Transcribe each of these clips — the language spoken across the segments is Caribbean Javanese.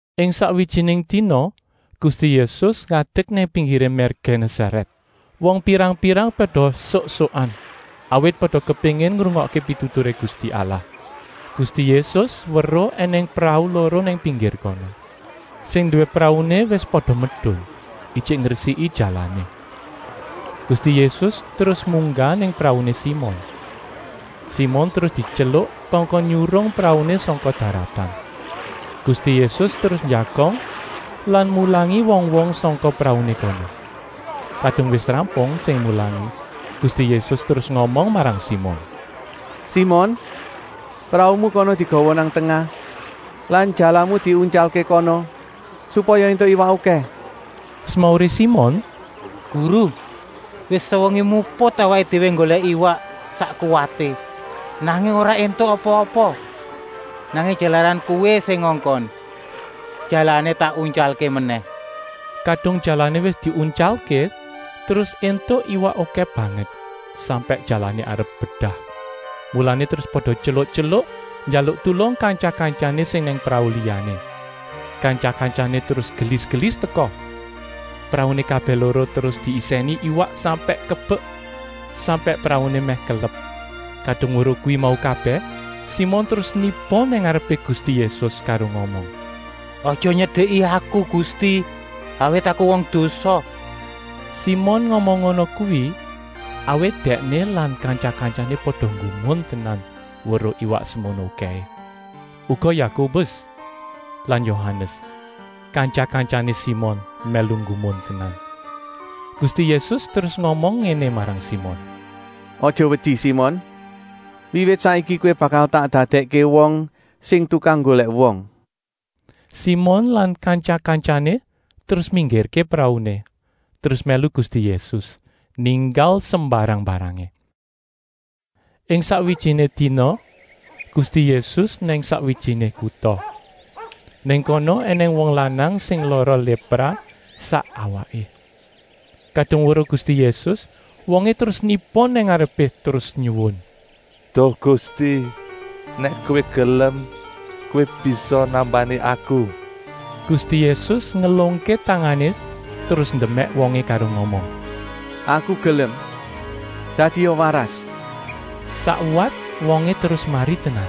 Ing sakwijiné dina Gusti Yésus ngadek nang pinggiré mér Genésarèt. Wong pirang-pirang pada esuk-esukan, awit pada kepéngin ngrungokké pituturé Gusti Allah. Gusti Yésus weruh ènèng prau loro nang pinggir kono. Sing nduwé prauné wis pada medun, ijik ngresiki jalané. Gusti Yésus terus munggah nang prauné Simon. Simon terus dityeluk kongkon nyurung prauné sangka daratan. Gusti Yésus terus njagong lan mulangi wong-wong sangka prauné kono. Kadung wis rampung sing mulangi, Gusti Yésus terus ngomong marang Simon: “Simon, praumu kana digawa nang tengah lan jalamu diuntyalké kono supaya éntuk iwak okèh.” Semauré Simon: “Guru, wis sewengi muput awaké déwé nggolèk iwak sak kuwaté, nanging ora éntuk apa-apa. Nanging jalaran Kowé sing ngongkon, jalané tak untyalké menèh.” Kadung jalané wis diuntyalké terus éntuk iwak okèh banget, sampèk jalané arep bedah. Mulané terus pada tyeluk-tyeluk njaluk tulung kantya-kantyané sing nang prau liyané. Kantya-kantyané terus gelis-gelis teka. Prauné kabèh loro terus diisèni iwak sampèk kebek, sampèk prauné mèh kelep. Kadung weruh kuwi mau kabèh, Simon terus niba nang ngarepé Gusti Yésus karo ngomong: “Aja nyedeki aku Gusti, awit aku wong dosa.” Simon ngomong ngono kuwi, awit dèkné lan kantya-kantyané pada nggumun tenan weruh iwak semono okèhé. Uga Yakobus lan Yohanes, kantya-kantyané Simon, mèlu nggumun tenan. Gusti Yésus terus ngomong ngéné marang Simon: “Aja wedi Simon, wiwit saiki kowé bakal tak dadèkké wong sing tukang nggolèk wong.” Simon lan kantya-kantyané terus minggirké prauné, terus mèlu Gusti Yésus, ninggal sembarang-mbarangé. Ing sakwijiné dina Gusti Yésus nang sakwijiné kuta. Nang kono ènèng wong lanang sing lara lépra sak awaké. Kadung weruh Gusti Yésus, wongé terus niba nang ngarepé terus nyuwun: “Duh Gusti, nèk Kowé gelem Kowé bisa nambani aku!” Gusti Yésus ngelungké tangané terus ndemèk wongé karo ngomong: “Aku gelem, dadia waras!” Sakwat wongé terus mari tenan.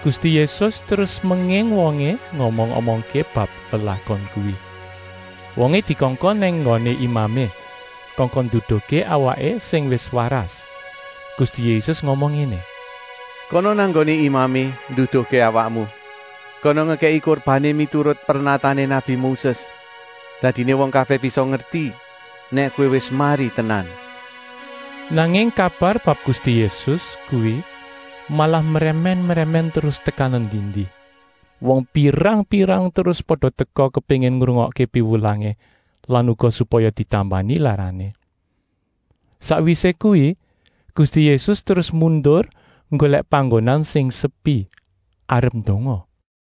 Gusti Yésus terus menging wongé ngomong-omongké bab lelakon kuwi. Wongé dikongkon nang nggoné imamé, kongkon nduduhké awaké sing wis waras. Gusti Yésus ngomong ngéné: “Kana nang nggoné imamé nduduhké awakmu. Kana ngekèki kurbané miturut pernatané nabi Moses. Dadiné wong kabèh bisa ngerti nèk kowé wis mari tenan.” Nanging kabar bab Gusti Yésus kuwi malah mrèmèn-mrèmèn terus tekan endi-endi. Wong pirang-pirang terus pada teka kepéngin ngrungokké piwulangé lan uga supaya ditambani larané. Sakwisé kuwi Gusti Yésus terus mundur nggolèk panggonan sing sepi, arep ndonga.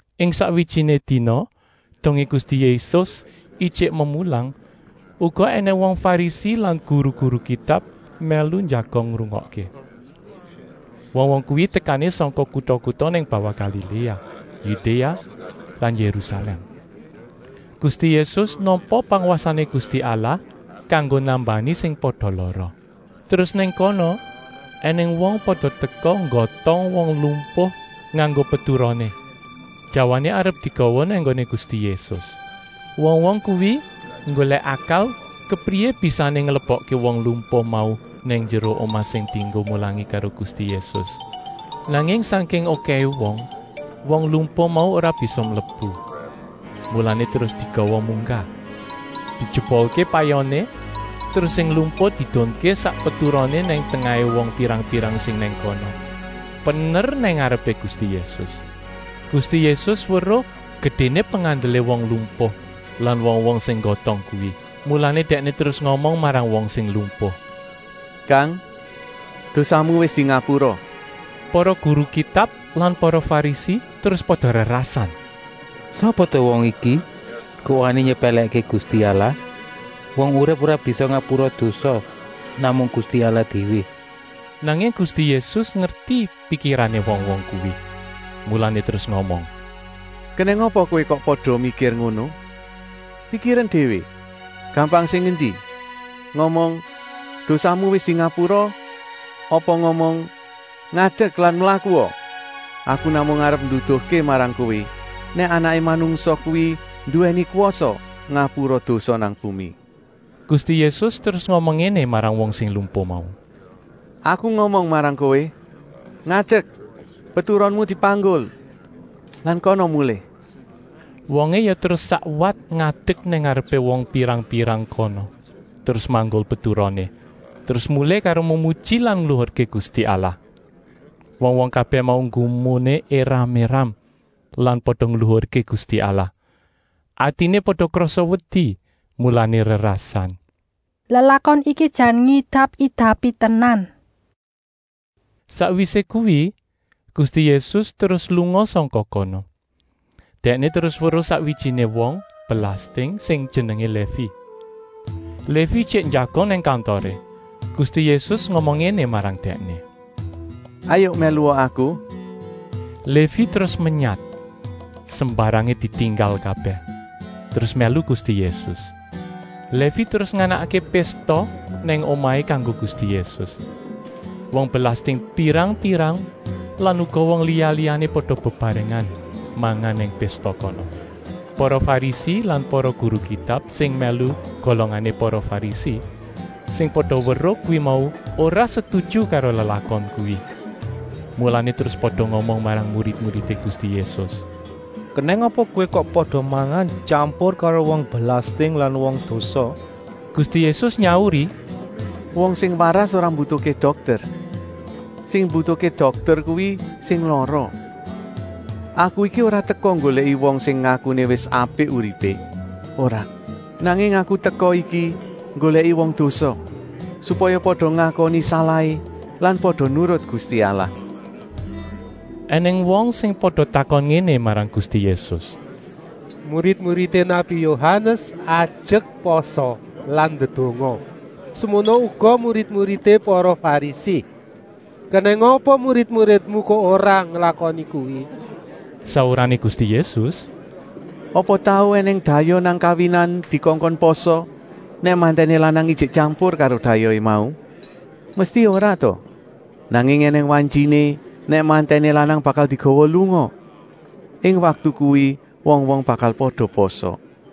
Ing sakwijiné dina, dongé Gusti Yésus ijik memulang, uga ènèng wong Farisi lan guru-guru Kitab mèlu njagong ngrungokké. Wong-wong kuwi tekané sangka kuta-kuta nang bawah Galiléa, Yudéa lan Yérusalèm. Gusti Yésus nampa pangwasané Gusti Allah kanggo nambani sing pada lara. Terus nang kono ènèng wong pada teka nggotong wong lumpuh nganggo peturoné. Jawané arep digawa nang nggoné Gusti Yésus. Wong-wong kuwi nggolèk akal kepriyé bisané nglebokké wong lumpuh mau nang njero omah sing dienggo mulangi karo Gusti Yésus. Nanging sangking okèhé wong, wong lumpuh mau ora bisa mlebu. Mulané terus digawa munggah, dijebolké payoné, terus sing lumpuh diedunké sak peturoné nang tengahé wong pirang-pirang sing nang kono, pener nang ngarepé Gusti Yésus. Gusti Yésus weruh gedéné pengandelé wong lumpuh lan wong-wong sing nggotong kuwi, mulané Dèkné terus ngomong marang wong sing lumpuh: “Kang, dosamu wis dingapura!” Para guru Kitab lan para Farisi terus pada rerasan: “Sapa ta wong iki kok wani nyepèlèkké Gusti Allah? Wong urip ora bisa ngapura dosa, namung Gusti Allah déwé?” Nanging Gusti Yésus ngerti pikirané wong-wong kuwi, mulané terus ngomong: “Kenèng apa kowé kok pada mikir ngono? Pikiren déwé, gampang sing endi: ngomong ‘dosamu wis dingapura’ apa ngomong ‘ngadek lan mlakua?’ Aku namung arep nduduhké marang kowé nèk Anaké Manungsa kuwi nduwèni kwasa ngapura dosa nang bumi.” Gusti Yésus terus ngomong ngéné marang wong sing lumpuh mau: “Aku ngomong marang kowé: ‘Ngadek, peturonmu dipanggul lan kana mulih!’” Wongé ya terus sakwat ngadek nang ngarepé wong pirang-pirang kono, terus manggul peturoné, terus mulih karo memuji lan ngluhurké Gusti Allah. Wong-wong kabèh mau nggumuné éram-éram lan pada ngluhurké Gusti Allah. Atiné pada krasa wedi, mulané rerasan: “Lelakon iki jan ngidap-idapi tenan!” Sakwisé kuwi Gusti Yésus terus lunga sangka kono. Dèkné terus weruh sakwijiné wong belasting sing jenengé Lévi. Lévi ijik njagong nang kantoré. Gusti Yésus ngomong ngéné marang dèkné: “Hayuk mèlua Aku.” Lévi terus menyat, sembarangé ditinggal kabèh, terus mèlu Gusti Yésus. Lévi terus nganakké pésta nang omahé kanggo Gusti Yésus. Wong belasting pirang-pirang lan uga wong liya-liyané pada bebarengan mangan nang pésta kono. Para Farisi lan para guru Kitab sing mèlu golongané para Farisi sing pada weruh kuwi mau ora setuju karo lelakon kuwi. Mulané terus pada ngomong marang murid-muridé Gusti Yésus: “Kenèng apa kowé kok pada mangan tyampur karo wong belasting lan wong dosa?” Gusti Yésus nyauri: “Wong sing waras ora mbutuhké dokter. Sing mbutuhké dokter kuwi sing lara. Aku iki ora teka nggolèki wong sing ngakuné wis apik uripé, ora. Nanging aku teka iki nggolèki wong dosa, supaya pada ngakoni salahé lan pada nurut Gusti Allah.” Enèng wong sing pada takon ngéné marang Gusti Yésus: “Murid-muridé nabi Yohanes ajek pasa lan ndedonga, semono uga murid-muridé para Farisi. Kenèng apa murid-muridmu kok ora nglakoni kuwi?” Saurané Gusti Yésus: “Apa tau ènèng dayoh nang kawinan dikongkon pasa, nèk mantèné lanang ijik tyampur karo dayohé mau? Mesti ora ta! Nanging ènèng wantyiné nèk mantèné lanang bakal digawa lunga. Ing waktu kuwi wong-wong bakal pada pasa.”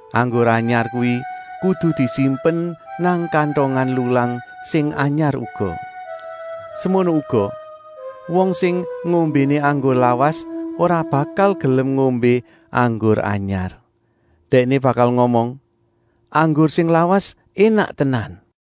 Anggur anyar kuwi kudu disimpen nang kantongan lulang sing anyar uga. Semono uga, wong sing ngombéné anggur lawas ora bakal gelem ngombé anggur anyar. Dèkné bakal ngomong: ‘Anggur sing lawas énak tenan.’”